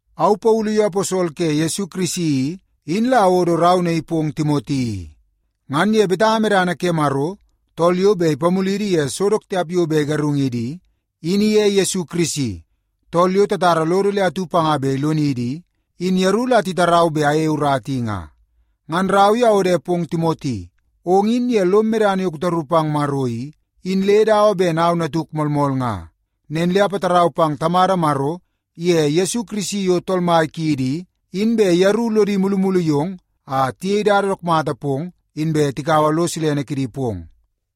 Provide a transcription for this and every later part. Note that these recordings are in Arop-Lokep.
Au Paulu yo aposol ke Yesu Kirisi i, in la awodo rau naii pong Timoti i. Ngan ye betanga medana ke Maro, tool yo bet ipamulidi ye so dook tiap yo bet igarungidi i, in iye Yesu Kirisi, tool yo tatara lodo le atu panga bet ilonidi i, in yeru la titarau bet ayei urata i nga. Ngan rau i awode pong Timoti. Ong in ye lom medana yo kutaru pang Maro i, in le dawa ben au natuk moolmool nga. Nen le apatarau pang Tamada Maro iye Yesu Kirisi yo Tool Mai kiidi i, in bet yeru lodi mulumulu yong a tiyei dada dook mata pong, inbe tikaua lo silene kidi pong.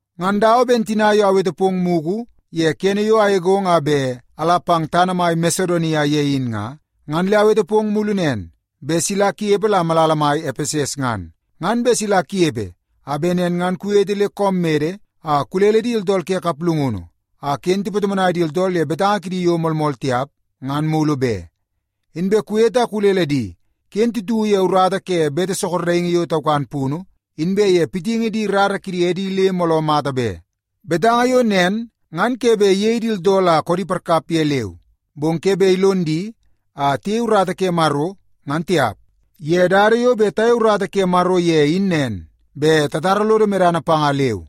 Ngan dawa ben tina yo awete pong mugu ye kene yo agegong a bet ala pang tana mai Masedonia ye in nga, ngan le awete pong mulu nen, bet sila kunepe la malala mai Epeses ngan. Ngan bet sila kunepe a bet nen ngan kuwete le koom mede a kulele di tooltool ke kaplungunu a ken tipatomonai di tooltool ye betanga kidi yo moolmool tiap ngan mulu be. Inbe kuwete a kulele di ken titu ye urata ke bete sorokingi yo taukan punu, inbe ye pitingi di rara kidi edi le mooloo mata be. Betanga yo nen ngan ke bet iyei di tooltool a koodi parkap ye leu, bong ke bet ilon di a tiyei urata ke Maro, ngan tiap. Ye dada yo bet tayei urata ke Maro ye in nen, bet tatara lodo medana panga leu.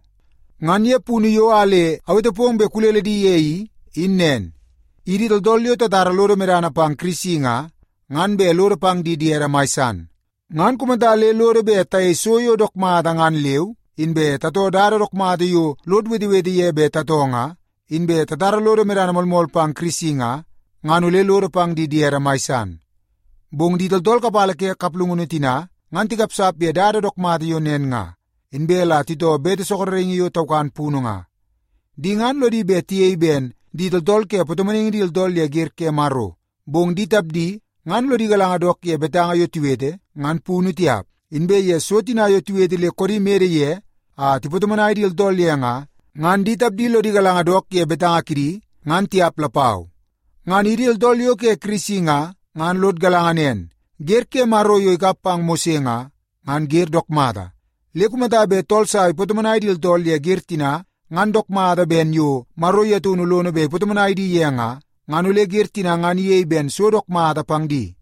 Ngan ye punu yo a le awete pong bet kulele di ye i, in nen. Idi tooltool yo tatara lodo medana pang Kirisi nga, ngan bet lodo pang di diede mai san. Ngan kumata le lodo bet tayei so yo dook mata ngan leu, inbe tatoo dada dook mata yo lod wetewete ye bet tatoo nga, inbe tatara lodo medana moolmool pang Kirisi nga, ngan ole lodo pang di diedi mai san. Bong di tooltool kapala ke kaplungunu tina ngan tikapsap ye dada dook mata yo nen nga, inbe la titoo bete sorokingi yo taukan punu nga. Di ngan lodi bet tiyei ben di tooltool ke patomonaingi di tooltool ye wer ke Maro, bong di tapdi ngan lodi galanga dook ye betanga yo tiwete, ngan punu tiap. Inbe ye so tina yo tiwete le koodi mede ye a tipatomonai di tooltool ye nga, ngan di tapdi lodi galanga dook ye betanga kidi, ngan tiap lapau. Ngan idi tooltool yo ke Kirisi nga, ngan lod galanga nen, wer ke Maro yo ikap pang Mose nga, ngan wer dook mata. Le kumata bet tool sa ipatomonai di tooltool ye wer tina ngan dook mata ben yo Maro ye taunu lono bet ipatomonai di ye nga, ngan ole wer tina ngan iyei ben so dook mata pang di.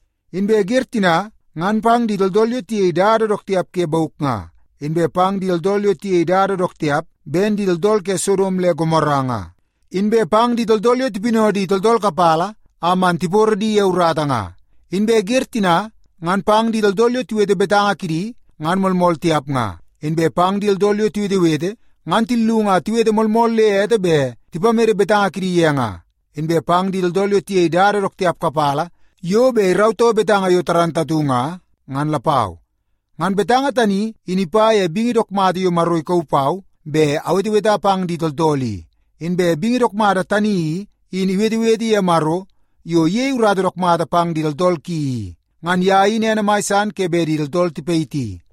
Inbe wer tina ngan pang di tooltool yo tiyei dada dook tiap ke bauk nga, inbe pang di tooltool yo tiyei dada dook tiap ben di tooltool ke Sodom le Gomora nga, inbe pang di tooltool yo tipinau di tooltool kapala a man tiporo di ye urata nga. Inbe wer tina ngan pang di tooltool yo tiwete betanga kidi ngan moolmool tiap nga, inbe pang di tooltool yo tiwetewete ngan tillung a tiwete moolmool le ete bet tipamede betanga kidi ye nga, inbe pang di tooltool yo tiyei dada dook tiap kapala yo bet irautoo betanga yo moolmool nga, ngan lapau. Ngan betanga tani, in ipa ye bingi dook mata yo Maro ikauu pau bet aweteweta pang di tooltool i. Inbe bingi dook mata tani i, in iwetewete ye Maro yo iyei urata dook mata pang di tooltool ki i. Ngan ye in ene mai san ke bet di tooltool tipayiti.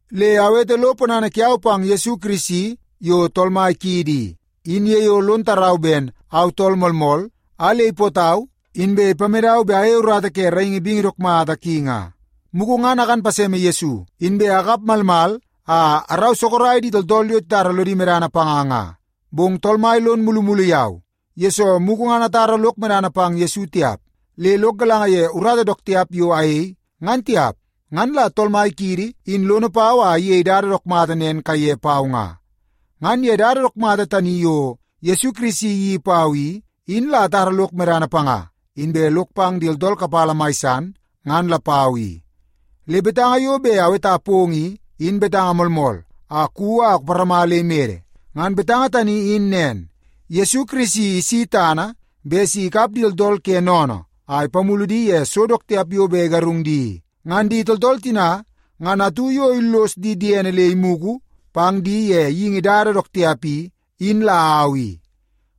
Le awete lo ponana kiau pang Yesu Kirisi yo Tool Mai kiidi i, in ye yo lon tarau ben au tool moolmool a le ipootau inbe ipamedau bet ayei urata ke raingi bingi dook mata ki nga. Mugu ngan akan paseme Yesu, inbe akap malmal a arau sorok di tooltool yo titara lodi medana panga nga. Bong Tool Mai lon mulumulu yau, yesoo mugu ngan atara lok medana pang Yesu tiap, le lok galanga ye urata dook tiap yo ayei, ngan tiap. Ngan la Tool Mai kiidi in lono pau a iyei dada dook mata nen kaiye pau. Ngan ye dada dook mata tani yo Yesu Kirisi iyeii pau i, in la atara lok medana panga, inbe lok pang di tooltool kapala mai san, ngan lapau i. Le betanga yo bet aweta pong i, in betanga moolmool a kuwi a kuparama le imede. Ngan betanga tani in nen; Yesu Kirisi isi tana bet si ikap di tooltool ke sennene a ipamulu di ye so dook tiap yo bet igarung di i. Ngan di tooltool tina, ngan atu yo illos di diene le imugu pang di ye geingi dada dook tiap i, in la au i.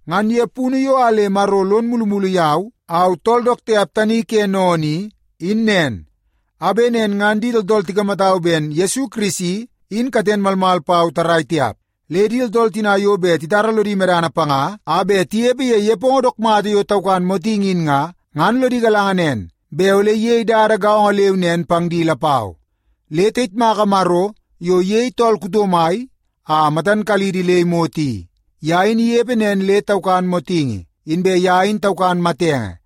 Ngan ye punu yo a le Maro lon mulumulu yau, au tool dook tiap tani ke sennene i, in nen a bet nen ngan di tooltool tikamatau ben Yesu Kirisi, in katen malmal pau tarrai tiap. Le di tooltool tina yo bet titara lodi medana panga a bet tinepe ye nepongo dook mata yo taukan motingi in nga, ngan lodi galanga nen bet ole iyei dada gaongo leu nen pang di lapau. Le tayitmaka Maro yo iyei tool kuto mai a matan kalidi le imot i. Ye in inepe nen le taukan motingi, inbe ye in taukan matenge,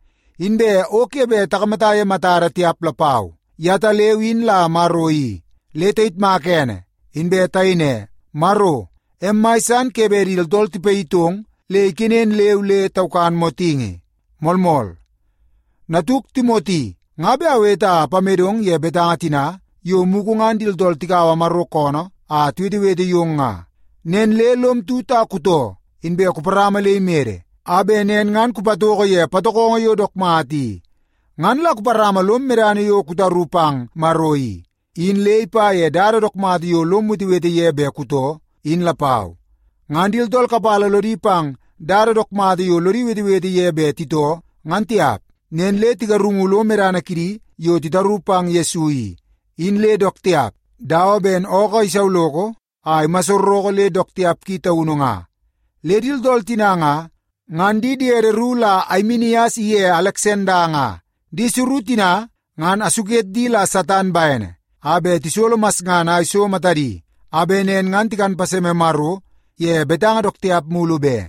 inbe o ke bet takamata ye matada tiap lapau. Yetaleu in la Maro i. Le tayitmaka ene inbe tayei ne, “Maro, em mai san ke bet di tooltool tipayitong le ikenen leu le taukan motingi.” Moolmool. Natuk Timoti, nga bet awete a apamedong ye betanga tina yo mugu ngan di tooltool tikaua Maro koonoo a tiwetewete yong nga. Nen le lom tut a kutoo, inbe kuparama le imede a bet nen ngan kupatoko ye patokongo yo dook mata i. Ngan la kuparama lom medana yo kutaru pang Maro i, in le ipa ye dada dook mata yo lom wetewete ye bet kutoo, in lapau. Ngan di tooltool kapala lodi pang dada dook mata yo lodi wetewete ye bet titoo ngan tiap. Nen le tigarungu lo medana kidi yo titaru pang Yesu i, in le dook tiap dawa ben ookoo isauloko a imassoroko le dook tiap ki taunu nga. Le di tooltool tina nga, ngan di diedi ru la Aimenias iye Aleksanda nga. Di suru tina ngan asuket di la Satan bene a bet tisolo masngana a iso matadi, a bet nen ngan tikan paseme Maro ye betanga dook tiap mulu be.